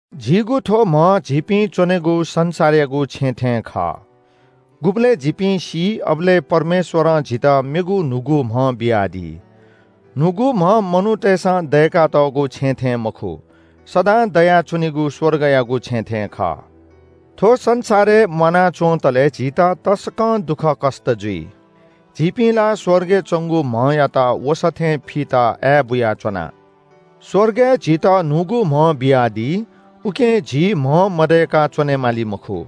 झीगु थ्‍व म्‍ह झीपिं च्‍वनेगु संसारयागु छेँ थें खः। गुबलय् झीपिं सी अबलय् परमेश्‍वरं झीत मेगु न्‍हूगु म्‍ह बियादी। न्‍हूगु म्‍ह मनूतय्‌सं दय्‌कातःगु छेँ थें मखु। सदां दयाच्‍वनीगु स्‍वर्गयागु छेँ थें खः। थ्‍व संसारय् म्‍वाना च्‍वंतले झीत तसकं दुःखकष्‍ट जुइ। झीपिं ला स्‍वर्गय् च्‍वंगु म्‍हयात वसः थें फीत आय्‌बुयाच्‍वना। स्‍वर्गय् झीत न्‍हूगु म्‍ह बियादी, उकिं झी म्‍ह मदय्‌क च्‍वनेमाली मखु।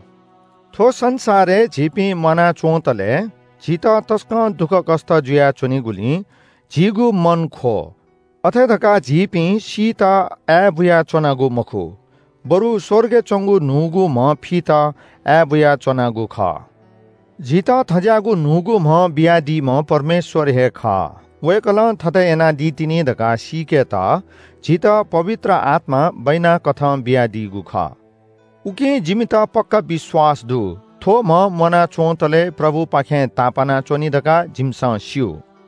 थ्‍व संसारय् झीपिं म्‍वाना च्‍वंतले झीत तसकं दुःखकष्‍ट जुया च्‍वनीगुलिं झीगु मन ख्‍वः। अथे धकाः झीपिं सीत आय्‌बुयाच्‍वनागु मखु, बरु स्‍वर्गय् च्‍वंगु न्‍हूगु म्‍ह फीत आय्‌बुयाच्‍वनागु खः। झीत थज्‍याःगु न्‍हूगु म्‍ह बियादीम्‍ह परमेश्‍वर हे खः। वय्‌कलं थथे यानादी तिनि धकाः सीकेत झीत पवित्र आत्‍मा बैनाकथं बियादीगु खः। उकिं जिमित पक्‍का विश्‍वास दु। थ्‍व म्‍ह म्‍वाना च्‍वंतले प्रभुपाखें तापाना च्‍वनी धकाः जिमिसं स्‍यू।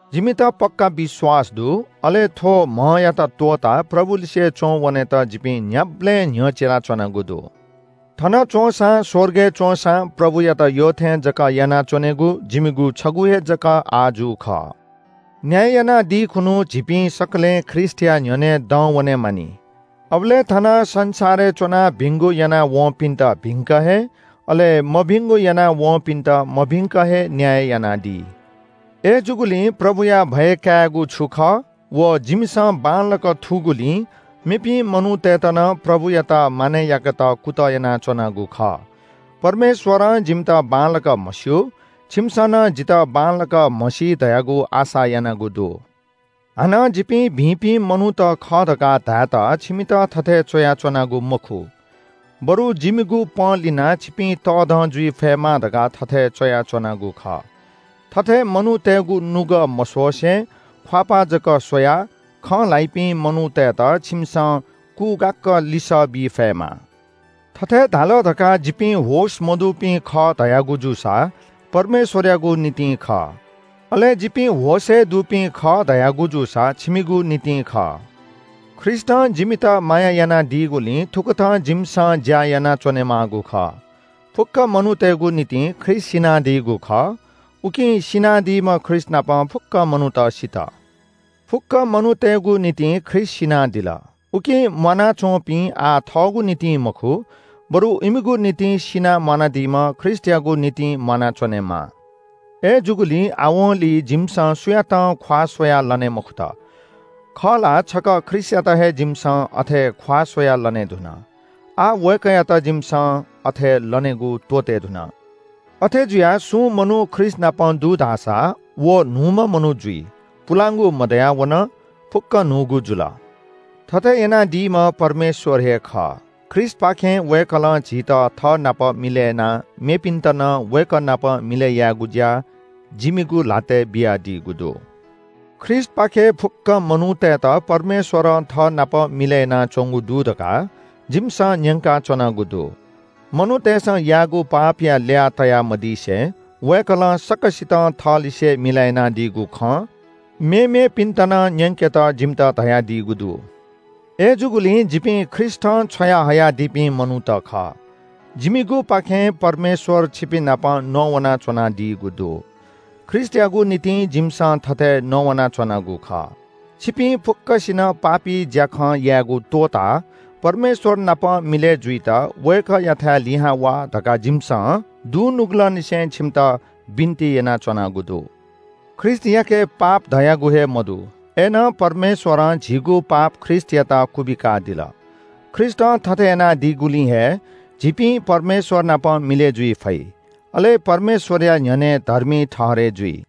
जिमित पक्‍का विश्‍वास दु, अले थ्‍व म्‍हयात त्‍वःताः प्रभुलिसे च्‍वंवनेत जिपिं न्‍ह्याबलें न्‍ह्यचिलाच्‍वनागु दु। थन च्‍वंसां स्‍वर्गय् च्‍वंसां प्रभुयात यःथें जक यानाच्‍वनेगु जिमिगु छगू हे जक आजु खः। न्‍याय यानादी खुन्‍हु झीपिं सकलें ख्रीष्‍टया न्‍ह्यःने दंवने मानि। अबलय् थन संसारय् च्‍वनाः भिंगु यानावंपिन्‍त भिंक हे, अले मभिंगु यानावंपिन्‍त मभिंक हे न्‍याय यानादी। अय्‌जूगुलिं प्रभुया भय कायेगु छु खः व जिमिसं बांलाक थूगुलिं मेपिं मनूतय्‌त नं प्रभुयात मानय् याकेत कुतः यानाच्‍वनागु खः। परमेश्‍वरं जिमित बांलाक म्‍हस्‍यू, छिमिसं नं जितः बांलाक म्‍हसी धयागु आशा यानागु दु। हानं जिपिं भिंपिं मनूत खः धकाः धायेत छिमित थथे च्‍वयाच्‍वनागु मखु। बरु जिमिगु पंलिनाः छिपिं तःधं जुइ फयेमा धकाः थथे च्‍वयाच्‍वनागु खः। थथे मनूतय्‌गु नुगः मस्‍वसे, ख्‍वाःपाः जक स्‍वयाः खँ ल्‍हाइपिं मनूतय्‌त छिमिसं कुगाक्‍क लिसः बी फयेमा। थथे धाल धकाः जिपिं होश मदुपिं खः धयागु जूसा परमेश्‍वरयागु निंतिं खः। अले जिपिं होशय् दुपिं खः धयागु जूसा छिमिगु निंतिं खः। ख्रीष्‍टं जिमित माया यानादीगुलिं थुकथं जिमिसं ज्‍या यानाच्‍वनेमाःगु खः। फुक्‍क मनूतय्‌गु निंतिं ख्रीष्‍ट सिनादीगु खः, उकिं सिनादीम्‍ह ख्रीष्‍टनाप फुक्‍क मनूत सित। फुक्‍क मनूतय्‌गु निंतिं ख्रीष्‍ट सिनादिल। उकिं म्‍वानाच्‍वंपिं आः थःगु निंतिं मखु, बरु इमिगु निंतिं सिनाः म्‍वानादीम्‍ह ख्रीष्‍टयागु निंतिं म्‍वानाच्‍वनेमाः। अय्‌जूगुलिं आवंलि जिमिसं सुयातं ख्‍वाः स्‍वयाः लने मखुत। खः ला, छकः ख्रीष्‍टयात हे जिमिसं अथे ख्‍वाः स्‍वयाः लनेधुन। आः वय्‌कःयात जिमिसं अथे लनेगु त्‍वःतेधुन। अथे जुयाः सुं मनू ख्रीष्‍टनाप दु धाःसा व न्‍हूम्‍ह मनू जुइ। पुलांगु मदयावन, फुक्‍क न्‍हूगु जुल। थथे यानादीम्‍ह परमेश्‍वर हे खः। ख्रीष्‍टपाखें वय्‌कलं झीत थःनाप मिलय् यानाः मेपिन्‍त नं वय्‌कः नाप मिलय् याकेगु ज्‍या जिमिगु ल्‍हातय् बियादीगु दु। ख्रीष्‍टपाखें फुक्‍क मनूतय्‌त परमेश्‍वरं थःनाप मिलय् यानाच्‍वंगु दु धकाः जिमिसं न्‍यंकाच्‍वनागु दु। मनूतय्‌सं याःगु पापया ल्‍याः तयामदिसे वय्‌कलं सकसितं थःलिसे मिलय् यानादीगु खँ मेमेपिन्‍त नं न्‍यंकेत जिमित धयादीगु दु। अय्‌जूगुलिं जिपिं ख्रीष्‍टं छ्वयाहयादीपिं मनूत खः। जिमिगुपाखें परमेश्‍वर छिपिंनाप नवानाच्‍वनादीगु दु। ख्रीष्‍टयागु निंतिं जिमिसं थथे नवानाच्‍वनागु खः। छिपिं फुक्‍कसिनं पापी ज्‍याखँ यायेगु त्‍वःताः परमेश्‍वर नाप मिलय् जुइत वय्‌कःयाथाय् लिहां वा धकाः जिमिसं दुनुगलंनिसें छिमित बिन्‍ति यानाच्‍वनागु दु। ख्रीष्‍टयाके पाप धयागु हे मदु। अय्‌नं परमेश्‍वरं झीगु पाप ख्रीष्‍टयात क्‍वबिकादिल। ख्रीष्‍टं थथे यानादीगुलिं हे झीपिं परमेश्‍वर नाप मिलय् जुइ फइ, अले परमेश्‍वरया न्‍ह्यःने धर्मी ठहरय् जुइ।